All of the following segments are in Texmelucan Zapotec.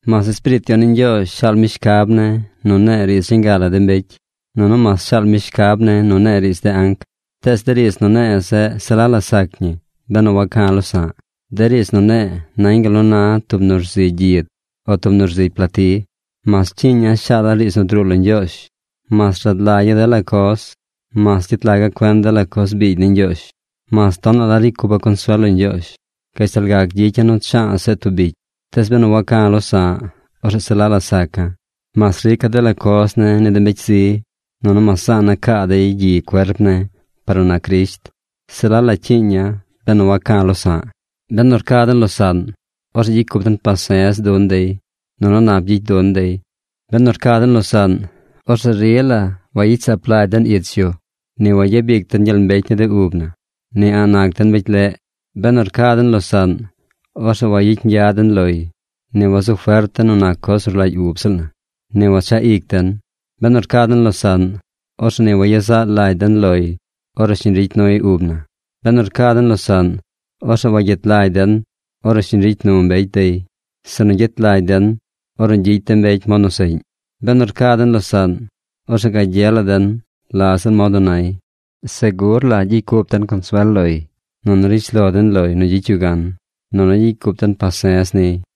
Mas Espiriit Yon ni Ñgyoozh shaal mi shcab ne̱ nu ne̱e̱ riidz reñ ga la de mbecy, nunu mas shaal mi shcab ne̱ nu ne̱e̱ riidz de anc, tees de riidz nu ne̱e̱ zeꞌ se la la sac ñi benu waca̱ losa̱ꞌ. De riidz nu ne̱e̱ nañ gal nu na tub nu rzigy gyid o tub nu rzigy plati. Mas cyiiña̱ shaala̱ riidz nu druu lo Ñgyoozh, mas rad lagya̱ dela coz, mas gyet laga̱ cuen dela coz biigy ni Ñgyoozh, mas tonaꞌ la ricy cupa̱ consuel lo Ñgyoozh, gashtal gac gyicya̱ nu cha̱a̱ seꞌ tub bicy, tees benu waca̱ losa̱ꞌ, orzeꞌ se la la saca̱. Mas rica̱ dela coz ne̱ ni de mbecy zi, nunu mas zaana̱ caa dey gyi cuerp ne̱ par nu nac Crisht, se la la cyiiña̱ benu waca̱ losa̱ꞌ. Benu rca den losaꞌn, orzeꞌ gyicy cup den pase̱z dun dey, nunu nap gyicy dun dey. Benu rca den losaꞌn, orzeꞌ rila wayicy saap lagy den ich yu, ni wayabic den gyel mbecy ni de ub na. Ni a̱ꞌ nac den mbecy leꞌ. Benu rca den losaꞌn, orzeꞌ wayicy ñgya den loy; ni wazu fert den nu nac coz nu rlagy ub ziꞌl na; ni wachaꞌ ic den. Benu rca den losaꞌn, orzeꞌ ni wayezaꞌ lagy den loy ornu shiñ ricy nuy ub na. Benu rca den losaꞌn, orzeꞌ wagyet lagy den ornu shiñ ricy nu mbecy dey, sinu gyet lagy den ornu gyicy de mbecy mod nu seꞌñ. Benu rca den losaꞌn, orzeꞌ gagye la den la ziꞌl mod nu nay. Segur la gyicy cup den consuel loy, nunu rishlo den loy nu gyicy yu gan, nunu gyicy cup den pase̱z niy.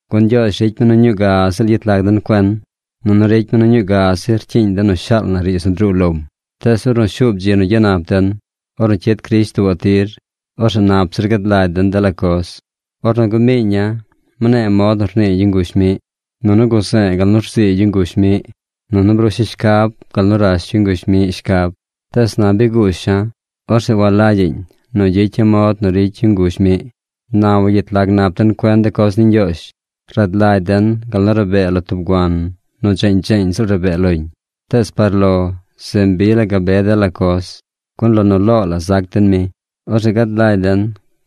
Gun Ñgyoozh ricy mi nu ñuu ga ziꞌl yet lag den cuen, nunu ricy mi nu ñuu ga zi rcyiiñ den nu shaal na riidz nu druu lom. Tees ornu shuub dzi nu gyanap den, ornu cyid Crisht tuubaꞌ tir, orzeꞌ nap zir gad lagy den dela coz. Ornu gumiiña̱, mne̱e̱ mod nu rnii yu nguzh miꞌ, nunu guze̱e̱ gal nu rzii yu nguzh miꞌ, nunu brusha̱ shcab gal nu rash yu nguzh miꞌ shcab. Tees na bi guusha̱. Orzeꞌ walagyaꞌñ nu gyicya̱ mod nu ricy yu nguzh miꞌ. Na wagyet lag nap den cuen de coz ni Ñgyoozh. Rad lagy den gal nu rabee lo tub guan nu dzeeñ dzeeñ ziꞌl rabee loñ. Tees par lo se mbi la gabe dela coz, gun lo nu loo la zac den mi. Orzeꞌ gad lagy den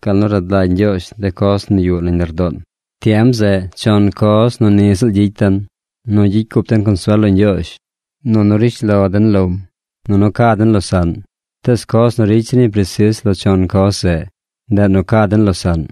gal nu rad lagy Ñgyoozh de coz nu yuꞌ nañ lardoon. Tiem zeꞌ chon coz nu ni ziꞌl gyicy den: nu gyicy cup den consuel lo Ñgyoozh, nunu rishlo den lom, nunu ca den losaꞌn. Tees coz nu ricy zir ñi presis lo chon coz zeꞌ, ndeꞌ nu ca den losaꞌn.